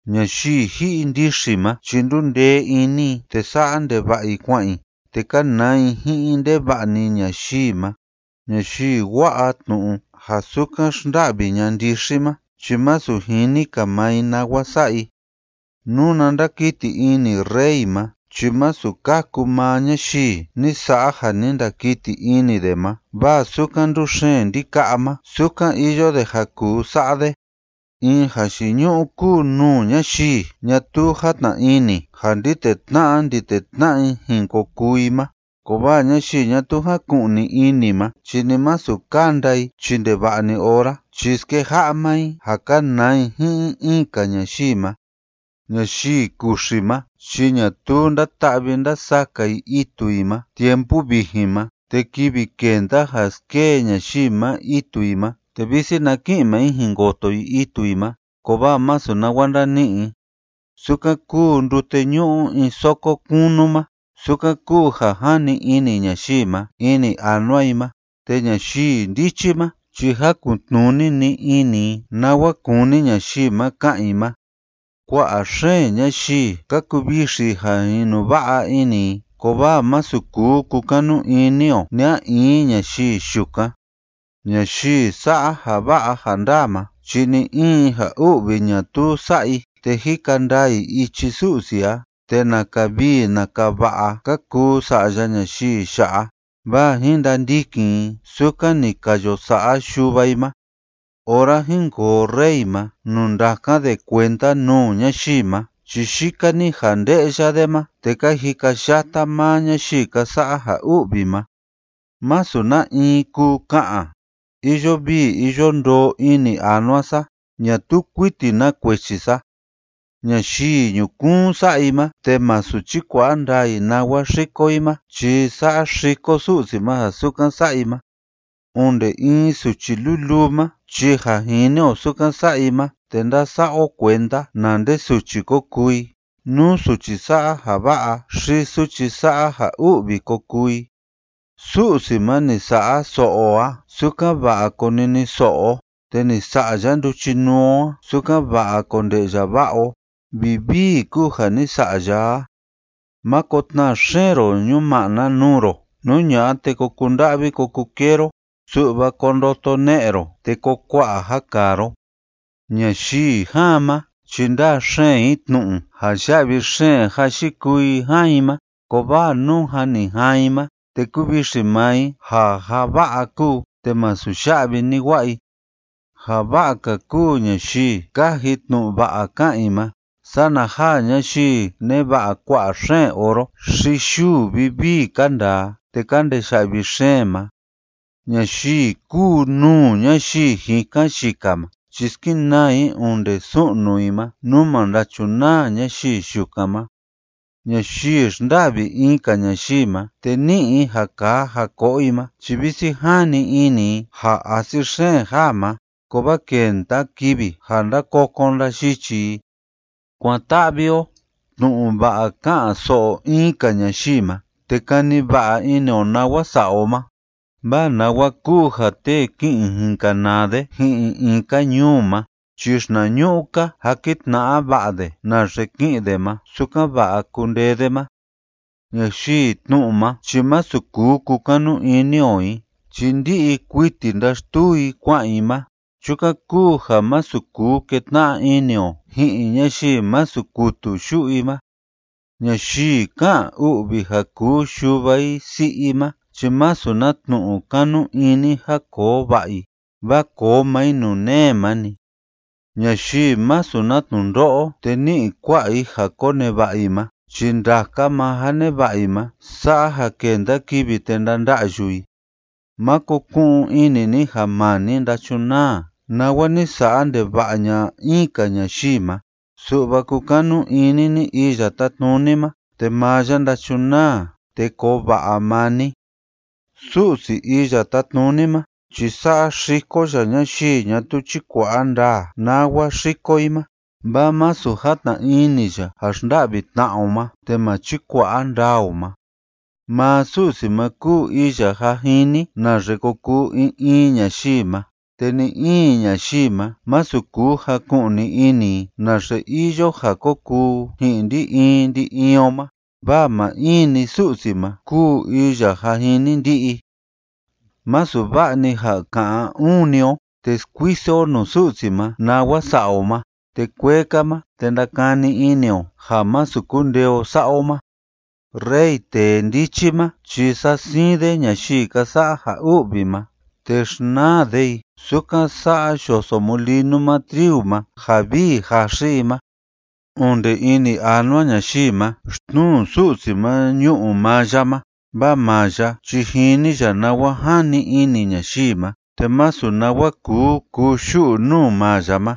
Ñayii ji'i ndixi ma chi ndúu ndee ini i te sa'a ndeva'a i kua'an i, te kánaa i ji'in ndeva'a‑ni ñayii ma. Ñayii wa'a tnu'u ja sukan xnda'vi ña'a ndixi ma chi masu jini‑ka maa i nawa sa'a i. Nuna ndakiti ini rey ma chi masu kaku maa ñayii ni sa'a ja ni ndakiti ini de ma, vaa sukan ndúxeen ndika'a ma, sukan iyo de ja kuu sa'a de. In jayiñu'u kúu nuu ñayii ñatuu játna ini ja ndi tetna'a ndi tetna'a i jin ko kuu i ma, kovaa ñayii ñatuu jáku'ni ini ma chi ni masu kanda i chi ndeva'a‑ni ora chi skeja'a maa i ja kanaa i ji'in in‑ka ñayii ma. Ñayii kuxi ma chi ñatuu ndáta'vi ndásaka i itu i ma tiempu vijin ma, te kivi kenda ja skee ñayii ma itu i ma, te visi na ki'in maa i jin koto i itu i ma, kovaa masu nawa ndani'i i. Sukan kúu ndute ñu'u in soko kunu ma, sukan kuu ja jani ini ñayii ma ini anua i ma, te ñayii ndichi ma chi jakun‑tnuni‑ni ini i nawa kúni ñayii ma ka'an i ma. Kua'a xeen ñayii ka kuvixi i ja inuva'a ini i, kovaa masu kuu kukanu ini o ni a in ñayii yukan. Ñayii sa'a ja va'a ja ndaa ma chi ni‑in ja u'vi ñatuu sa'a i, te jika ndaa i ichi Su'si a, te naka vii naka va'a ka kuu sa'ya ñayii ya'a, vaa jin ndandikin i sukan ni ka yo sa'a yuva i ma. Ora jínkoo rey ma nuu ndákan de kuenda nuu ñayii ma chi yika‑ni ja nde'ya de ma, te ka jikayata maa ñayii ka sa'a ja u'vi ma. Masu na in kuu ka'an: “Iyo vii iyo ndoo ini anua sa, ñatuu kuiti na kuechi sa.” Ñayii ñukuun sa'a i ma te masu chíkua'a ndaa i nawa xíko i ma chi saxiko Su'si ma ja sukan sa'a i ma. Onde in suchi luluu ma chi ja jini o sukan sa'a i ma, te ndasa'a o kuenda na nde suchi ko kuu i, nú suchi sa'a ja va'a xi suchi sa'a ja u'vi ko kuu i. Su'si ma ni sa'a so'o o a sukan‑va'a koniniso'o o, te ni sa'a ya nduchinuu o a sukan‑va'a konde'ya va'a o. ¡Vivii kúu ja ni sa'a ya a! Máko tnaa xeen ro ñuma'na nuu ro, nú ña'a, te ko kunda'vi ko kukee ro, su'va ko ndoto ne'e ro te koo kua'a ja kaa ro. Ñayii jaan ma chi ndáa xeen i tnu'u ja ya'vi xeen ja yikuu i jaan i ma, kovaa nú jâ ni jaan i ma, te kuvixi maa i ja ja va'a kúu te masu ya'vi ni wa'a i. Ja va'a‑ka kúu ñayii káji tnu'u va'a ká'an i ma sana ja ñayii neva'a kua'a xeen oro xi yuu vivii ka ndaa te ka ndeya'vi xeen ma. Ñayii kúu nuu ñayii jikan yika ma chi skenaa i onde su'nu i ma, nú ma ndachunaa ñayii yukan ma. Ñayii xnda'vi in‑ka ñayii ma te ni'i i ja kaa ja ko'o i ma chi visi jani ini i ja asi xeen jaa ma, kovaa kenda kivi ja ndakokon ndayichi i. Kuan‑ta'vi o tnu'u va'a ká'an‑so'o in‑ka ñayii ma te kani va'a ini o nawa sa'a o ma, vaa nawa kúu ja tee ki'in jin kanaa de ji'in in‑ka ñuu ma chi xinañu'u‑ka jakin tna'a va'a de naxe ki'in de ma sukan‑va'a kundee de ma. Ñayii tnu'u ma chi masu kuu kukanu ini o i chi ndi'i kuiti ndáxtuu i kua'an i ma, chukan kúu ja masu kuu ketna'a ini o ji'in ñayii masu kutu yu'u i ma. Ñayii ká'an u'vi ja kuu yuva i si'i i ma chi masu na tnu'u kanu ini ja koo va'a i, vaa koo maa i nuu nee ma‑ni. Ñayii masu na tnundo'o te ní'i kua'a i ja koneva'a i ma chi ndaka maa ja neva'a i ma sa'a ja kenda kivi te ndanda'yu i. Máko ku'un ini ni ja maa ni ndachunaa nawa ni sa'a ndeva'a ña'a in‑ka ñayii ma, su'va kukanu ini ni Iya Tátnuni ma, te maa ya ndachunaa te koo va'a maa ni. Su'si Iya Tátnuni ma chi saxiko ya ñayii ñatuu chíkua'a ndaa nawa xíko i ma, vaa masu játna ini ya ja xnda'vi tna'a o ma te ma chikua'a ndaa o ma. Maa Su'si ma kúu iya jâ jini naxe ko kuu in in ñayii ma, te ni‑in ñayii ma masu kuu jaku'ni ini i naxe iyo ja ko kuu ji'in ndi‑in ndi‑in o ma, vaa maa in‑ni Su'si ma kúu iya jâ jini ndi'i. Másu va'a‑ni ja ka'an uun‑ni o te skuiso o nuu Su'si ma nawa sa'a o ma te kuee‑ka ma te ndakani ini o ja masu kundee o sa'a o ma. Rey tee ndichi ma chi sa'a siin de ñayii ka sa'a ja u'vi ma, te xnaa de i sukan sa'a yoso mulinu ma triu ma ja vii jaxi i ma. Onde ini anua ñayii ma xtnuu Su'si ma ñu'u maa ya ma, vaa maa ya chi jini ya nawa jani ini ñayii ma, te masu nawa kuu kuyu'u nuu maa ya ma.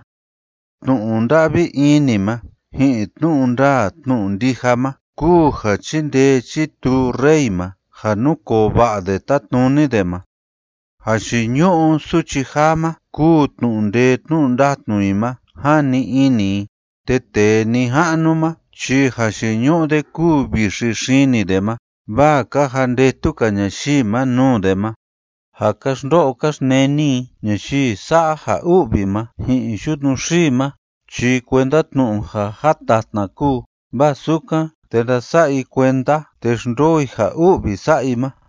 Tnu'u nda'vi ini ma ji'in tnu'u ndaa tnu'u ndija ma kúu ja chíndee chítuu rey ma ja núkoo va'a de tátnuni de ma. Jayiñu'u suchi jaa ma kúu tnu'u ndee tnu'u ndatnu i ma, jani ini i, te tee nija'nu ma chi jayiñu'u de kúu vixi xini de ma, vaa ka jandetu‑ka ñayii ma nuu de ma. Ja ka xndo'o ka xneni i ñayii sa'a ja u'vi ma ji'in yutnu xii ma chi kuenda tnu'u ja jatatna kúu, vaa sukan, te ndasa'a i kuenda te xndoo i ja u'vi sa'a i ma.